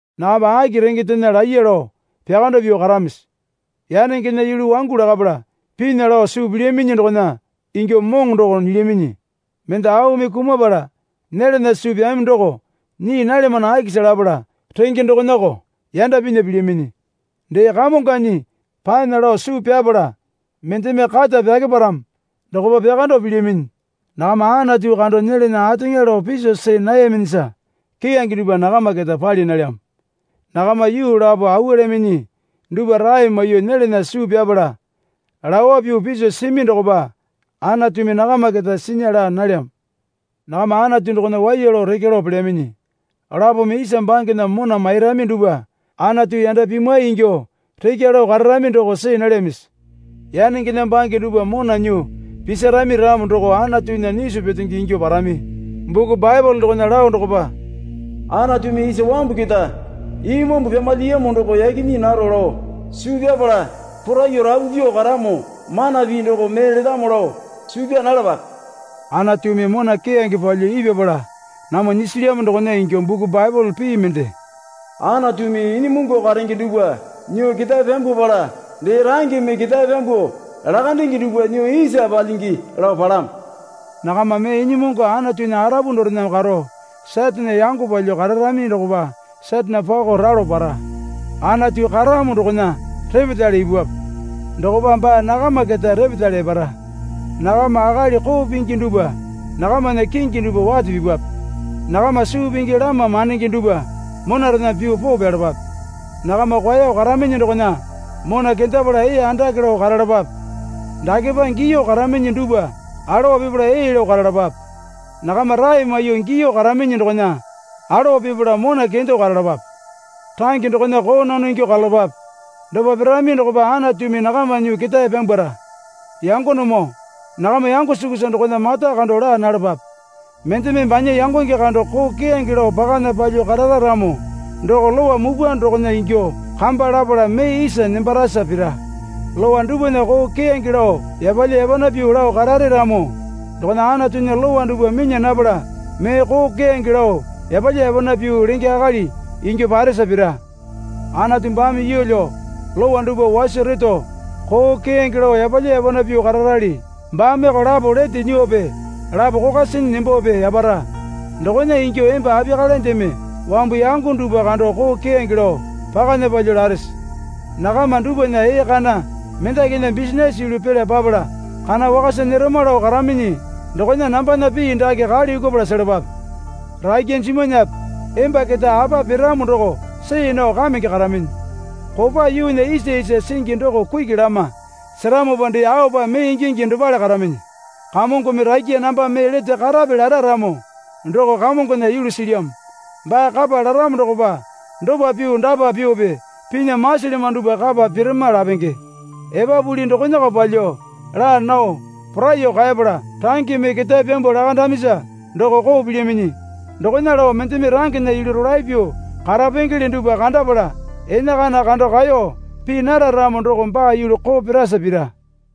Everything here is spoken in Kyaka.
Nakama aki rengendena laiya lao pyakando pyuo karamisi? Yanengena yulu wangu lakapala pinya lao suu pilyaminyi dokona ingyuo moŋo doko nyilyaminyi. Mende aumi kumapala nyelana suu pyami doko nyii nalyamano akisa lapala range dokonako yanda pinya pilyaminyi. Dee kamonganyi panya lao suu pyapala mendeme kata pyakeparamo dokopa pyakando pilyaminyi. Nakama Anatu kando nyelana ateŋa lao piso see nayaminyisa keyange dupwa nakama keta pali nalyamo. Nakama yuu lapo awualyaminyi dupwa rae maiyuo nyelana suu pyapala lawa pyuo piso simi dokopa Anatumi nakama keta sinya laa nalyamo. Nakama Anatu dokona waiya lao rekya lao pelyaminyi. Lapome isa bangena mona mairami dupwa Anatu yanda pimwai ingyuo rekya lao kararami doko see nalyamisi? Yanengena bange dupwa mona nyuo pisarami ramo doko Anatunya nyisu petenge ingyuo parami. Buku Baepole dokona lao dokopa, Anatumi isa wambu keta imambu pyamalyiyamo doko yaki nyii naro lao suu pyapala poraiyuo rapu pyuo karamo mana pii doko mee letamo lao suu pyaa nalapape. Anatumi mona keyange palyuo ipyapala namwa nyisilyamo dokona ingyuo buku Baepole pii mende, Anatumi inyimungu karenge dupwa nyuo ketae pyambwapala dee rangeme ketae pyambuo lakandenge dupwa nyuo isa palyingi lao palamo. Nakama mee inyimungu Anatunya arapu dorena karo Satane yango palyuo kararami dokopa Satane pako ralo para. Anatu karamo dokona repetale ipupwape. Dokopa baa nakama keta repetale epara. Nakama akali koo pingi dupwa nakamana kingi dupwa wate pipape. Nakama suu pingi lama mandenge dupwa monarena pyuo poo pyalapape. Nakama kwaeyo karaminyi dokona mona kendapala ee andake lao karalapape. Dakepa giyuo karaminyi dupwa alowa pipala ee lao karalapape. Nakama rae maiyuo giyuo karaminyi dokona alowa pipala mona kendo karalapape. Range dokona koo nono ingyuo karalapape. Dopa pirami dokopa Anatumi nakama nyuo ketae pyambwara. Yangonemoo nakama yango sukusa dokona mata kando laa nalapape. Mendeme banya yangonge kando koo keyange lao pakana palyuo karara ramo doko Lowa mupwa dokona ingyuo kamba lapala mee isa nembarasa pira. Lowa dupwana koo keyange lao yapalya yapana pyuo lao karare ramo dokona Anatunya Lowa dupwa minya napala mee koo keyange lao yapalya yapana pyuo lenge akali ingyuo paresa pira. Anatu baame yeelyo lowa dupwa waso reto koo keyange lao yapalya yapana pyuo kararali. Baameko lapo lete nyuope lapo kokwa sinyi nembope yapara. Dokona ingyuo emba apiyakalendeme wambu yango dupwa kando koo keyange lao pakana palyuo larese? Nakama dupwana ee kana mendakinya bisinase yulu pela papala kana wakasa nyerama lao karaminyi dokona nambana pii dake kale yukupala selapape. Rakya jimwanape emba keta apa piramo doko see nao kamenge karaminyi. Kopa yuunya isa isa singi doko kuki lama seramopa dee aopa mee ingingi dopale karaminyi. Kamongome rakya namba mee lete karape lara ramo doko Kamongona yulu silyamo. Baa kapa laramo dokopa dopa pyuo dapa pyuope pinya masilyamano dupwa kapa pirama lapenge. Epapuli dokonako palyuo laa nao poraiyuo kaepala rangeme ketae pyambuo lakandamisa doko koo pilyaminyi. Dokona lao mendeme rangena yulu rolae pyuo karapengele dupwa kandapala enakana kando kaeyo pii nara ramo doko baa yulu koo pirasa pira.